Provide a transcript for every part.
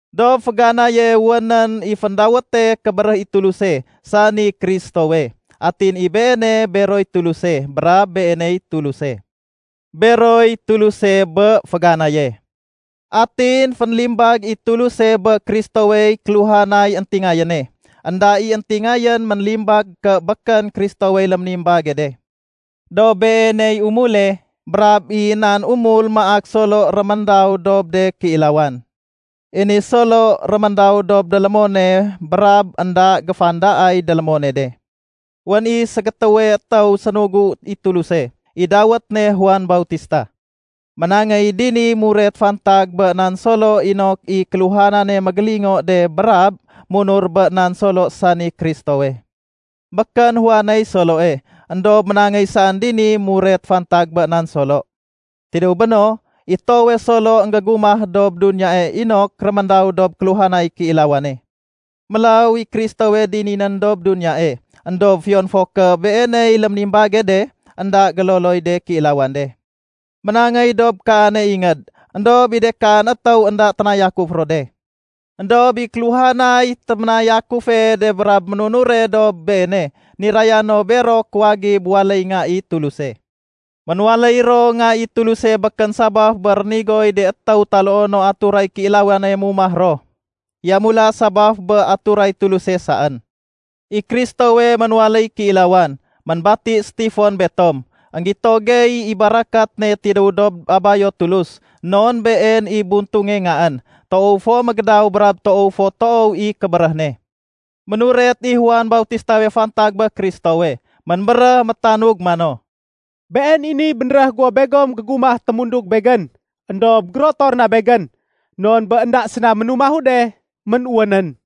Dob féganaye wénén i féndawéte “Kébéréh i Tuluse”, sani Kristowe. Atin i Beene beroy Tuluse. Brab Beeney Tuluse. Beroy Tuluse bé féganaye. Atin fénlimbag i Tuluse bé Kristowey kéluhanay éntingayéne. Enda i éntingayén ménlimbag ké békén Kristowey léménimbage de. Dob Beeney umule brab i nan umul maak Solo réméndaw dob de kéilawan. I ni Solo réméndaw dob délémone brab énda géfandaay délémone de. Wén i ségétéwe étéw sénugu i Tuluse, i dawét ne Juan Bautista. Ménangéy dini muret fantag bé nan Solo inok i kéluhanane mégélingo de brab munur bé nan Solo sani Kristowe. Békén Juaney Soloe, éndob ménangéy saén dini muret fantag bé nan Solo. Tidéw béno, i toowe Solo énggégumah dob duniyae inok réméndaw dob kéluhanay kéilawane. Mélaw i Kristowe dininén dob duniyae. Endob fiyon fo ké Beeney léménimbage de, énda géloloy de kéilawan de. Ménangéy dob kaane ingéd, éndob i de kaan étéw énda ténayakuf ro de. Endob i kéluhanay téménayakufe de brab ménunure dob Beene, niraya no bero kuwagib waléy nga i Tuluse. Ménwaléy ro nga i Tuluse békén sabaf bé rénigoy de étéw taloo no aturay kéilawane mumah ro, yamula sabaf bé aturay Tuluse saén. I Kristowe ménwaléy kéilawan, ménbati sétifon betom. Enggito gey i barakat ne tidéw dob Abayo Tulus, non been i buntunge Ngaén, toow fo mégédaw brab toow fo toow i kébéréh ne. Ménuret i Juan Bautistawe fantag bé Kristowe. Ménbéréh métanug mano, “Been i niy bénréh guwo begom gégumah témundug begén, éndob gérotor na begén, non bé énda séna ménumahu de, ménwénén.”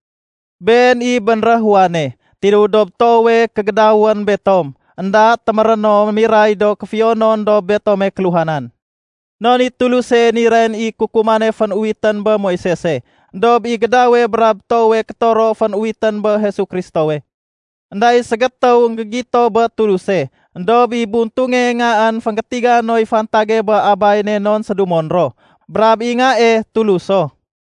Been i bénréh Juane. Tidéw dob toowe kégédawén betom, énda téméré no miray do kéfiyonon dob betome kéluhanan. Non i Tuluse nirayén i kukumane fén-uwitén bé Moisese, éndob i gédawe brab toowe kétoro fén-uwitén bé Jesu Kristowe. Enda i ségétéw énggégito bé Tuluse. Endob i Buntunge Ngaén, fénggétiga noy fantage bé Abay ne non sédumon ro. Brab i Ngae, Tulus so.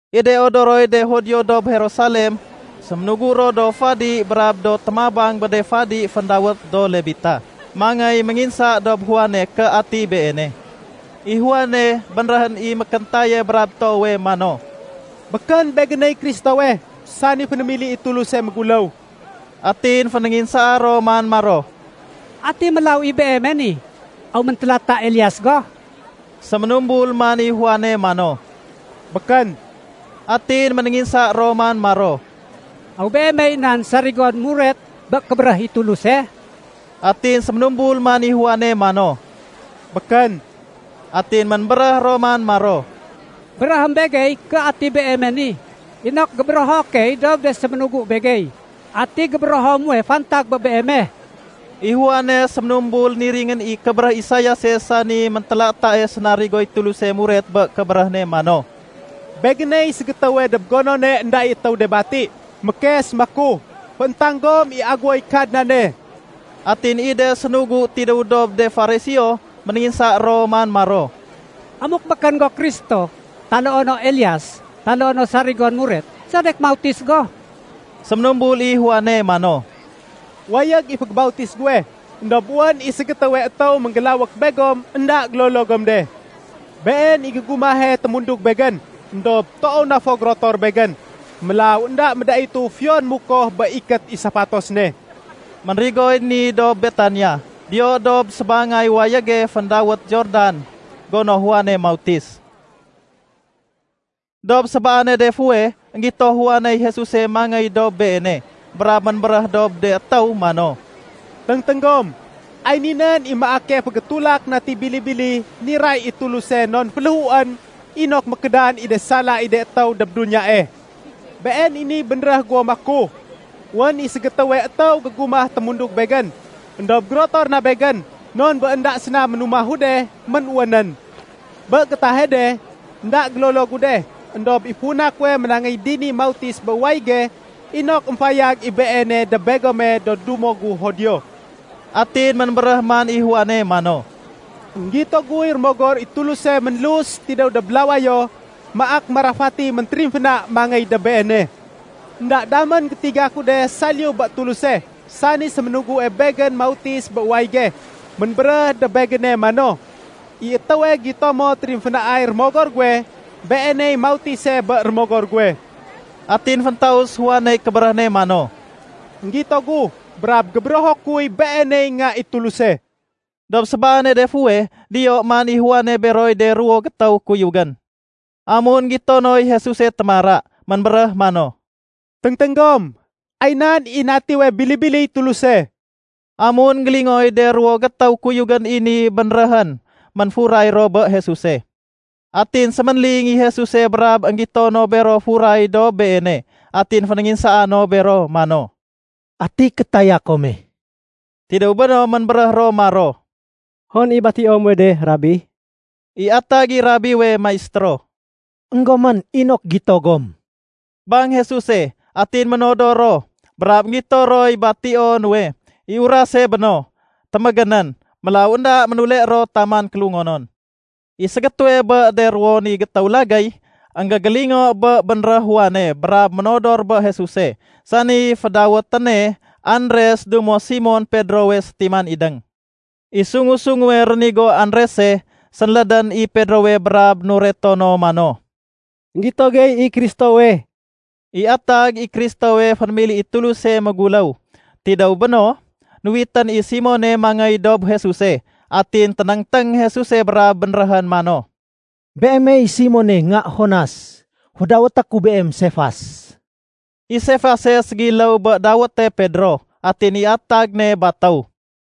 I de odoroy de Judio dob Jerusalem, séménugu ro do fadi brab do témabang bé de fadi féndawét do Lebita mangéy ménginsa dob Juane, ké ati beene. I Juane, bénréhén i mékéntaye brab toowe mano, “Békén begéney Kristowe, sani fénémili i Tuluse méguléw.” Atin fénénginsaa ro man maro, “Ati mélaw i beeme ni? Aw méntélata Elias go?” Séménumbul man i Juane mano, “Békén.” Atin ménénginsa ro man maro, “Aw beemey nan sarigon muret bé kébéréh i Tuluse?” Atin séménumbul man i Juane mano, “Békén.” Atin ménbéréh ro man maro, “Béréhém begey ké ati beeme ni, inok gébérého key dob de séménugu begey. Ati gébérého muwe fantag bé beeme?” I Juane séménumbul niringén i kébéréh Isaiase sani méntélatae sénarigoy Tuluse muret bé kébéréh ne mano, “Begéney ségétéwe dob gonone énda i étéw de bati, mékes maku, ‘Fééntang gom i aguwoy Kadnane.’” Atin i de sénugu tidéw dob de Fariseo, ménénginsa ro man maro, “Amuk békén go Kristo, taloo no Elias, taloo no sarigon muret, sedek mautis go?” Séménumbul i Juane mano, “Wayég i fégébautis guwe, éndob wén i ségétéwe étéw ménggélawék begom énda gélolo gom de. Been i gégumahe témundug begén, éndob toow na fo gérotor begén. Mélaw énda médaitu fiyon mukoh bé ikét i safatos ne.” Ménrigoy ni dob Betania, diyo dob sébangay wayége féndawét Jordan, gono Juane mautis. Dob sébaane de fuweh, énggito Juaney Jesuse mangéy dob beene, brab ménbéréh dob de étéw mano, “Téngténg gom, ay ni nén i maake fégétulak nati bili-bili niray i Tuluse non féléhuén inok mékédan i de sala i de étéw dob duniyae. Been i niy bénréh guwo maku, ‘Wén i ségétéwe étéw gégumah témundug begén, éndob gérotor na begén, non bé énda séna ménumahu de, ménwénén.’ Bé gétahe de, énda gélolo gu de, éndob i funa kuwe ménangéy dini mautis bé wayége inok émfayag i Beene dob begome do dumo gu Judio.” Atin ménbéréh man i Juane mano, “Enggito guy Rémogor i Tuluse ménlus tidéw dob lawayo maak marafati méntérimféna mangéy dob Beene. Enda damén gétiga ku de saliyu bé Tuluse, sani séménugue begén mautis bé wayége, ménbéréh dob begéne mano, ‘I étéwe gito mo térimfénaay Rémogor guwe, Beeney mautise bé Rémogor guwe.’” Atin féntaus Juaney kébéréh ne mano, “Enggito gu, brab gébérého kuy Beeney Nga i Tuluse.” Dob sébaane de fuweh, diyo man i Juane beroy de ruwo gétéw kuyugén. Amun énggito noy Jesuse témara, ménbéréh mano, “Téngténg gom, ay nan i natiwe bili-biliy Tuluse.” Amun énggélingooy de ruwo gétéw kuyugén i ni bénréhén, ménfuray ro bé Jesuse. Atin séménling i Jesuse brab énggito no bero furay dob Beene. Atin fénénginsaa no bero mano, “Ati kétaya kome?” Tidéw béno ménbéréh ro maro, “Hon i batio muwe de, Rabi?” (I atag i Rabiwe Maistéro.) “Enggomén, inok gito gom,” bang Jesuse. Atin ménodor ro, brab énggito roy batio nuwe. I urase béno, témégénén. Mélaw énda ménule ro taman kélungonon. I ségétéwe bé de ruwo ni gétéw lagéy énggégélingo bé bénréh Juane brab ménodor bé Jesuse, sani fédawéténe Andres dumo Simon Pedrowe sétiman idéng. I sungu-sunguwe rénigo Andrese, sénlédén i Pedrowe brab nureto no mano, “Enggito gey i Kristowe.” (I atag i Kristowe fénémili i Tuluse méguléw.) Tidéw béno, nuwitén i Simone mangéy dob Jesuse. Atin ténéngténg Jesuse brab bénréhén mano, “Beemey Simone, nga Jonas. Fédawété ku beem Sefas.” (I Sefase ségiléw bé dawéte Pedro, atin i atag ne batéw.)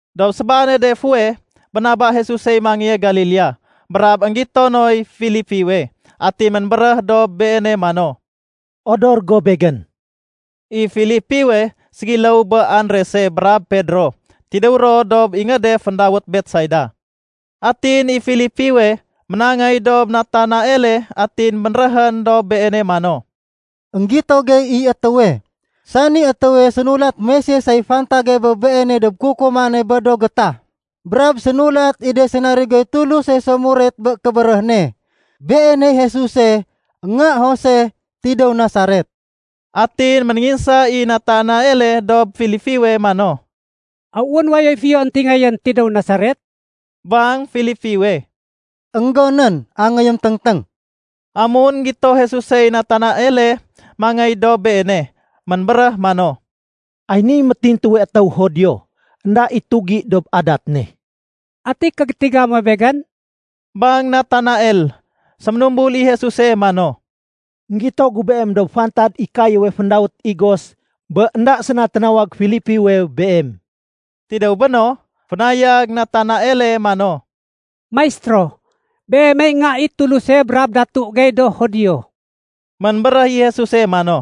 Dob sébaane de fuweh, bénaba Jesusey mangéye Galilea. Brab énggito noy Filipiwe, atin ménbéréh dob beene mano, “Odor go Begén.” I Filipiwe, ségiléw bé Andrese brab Pedro, tidéw ro dob ingéde féndawét Betsaida. Atin i Filipiwe, ménangéy dob Natanaele atin bénréhén dob beene mano, “Enggito gey i étéwe, sani étéwe sénulat Moisesey fantage bé Beene dob kukumane bé do gétah, brab sénulat i de sénarigoy Tuluse so muret bé kébéréh ne. Beeney Jesuse, nga Jose, tidéw Nasaret.” Atin ménénginsa i Natanaele dob Filipiwe mano, “Aw wén wayoy éntingayén fiyo tidéw Nasaret?” Bang Filipiwe, “Enggonén, angéyém téngténg.” Amun énggito Jesusey Natanaele mangéy dob Beene, ménbéréh mano, “Ay niy métintuwe étéw Judio. Enda i tugi dob adat ne.” “Ati kégétiga muwe begén?” bang Natanael. Séménumbul i Jesuse mano, “Enggito gu beem dob fantad i kayéwe féndawét igos bé énda séna ténawag Filipiwe beem.” Tidéw béno, fénayag Natanaele mano, “Maistéro, Beemey Nga i Tuluse brab Datu gey do Judio.” Ménbéréh i Jesuse mano,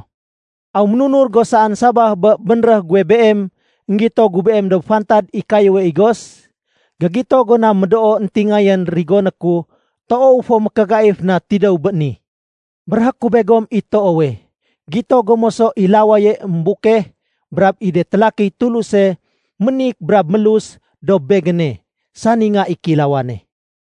“Aw ménunur go saén sabaf bé bénréh guwe beem énggito gu beem dob fantad i kayéwe igos? Gégito go na médoo éntingayén rigoné ku toow fo mékégaif na tidéw bé ni. Béréhé ku begom i toowe, gito gom moso i lawaye émbukeh brab i de télakiy Tuluse ménik brab mélus dob Begéne, sani Nga i Kéilawane.”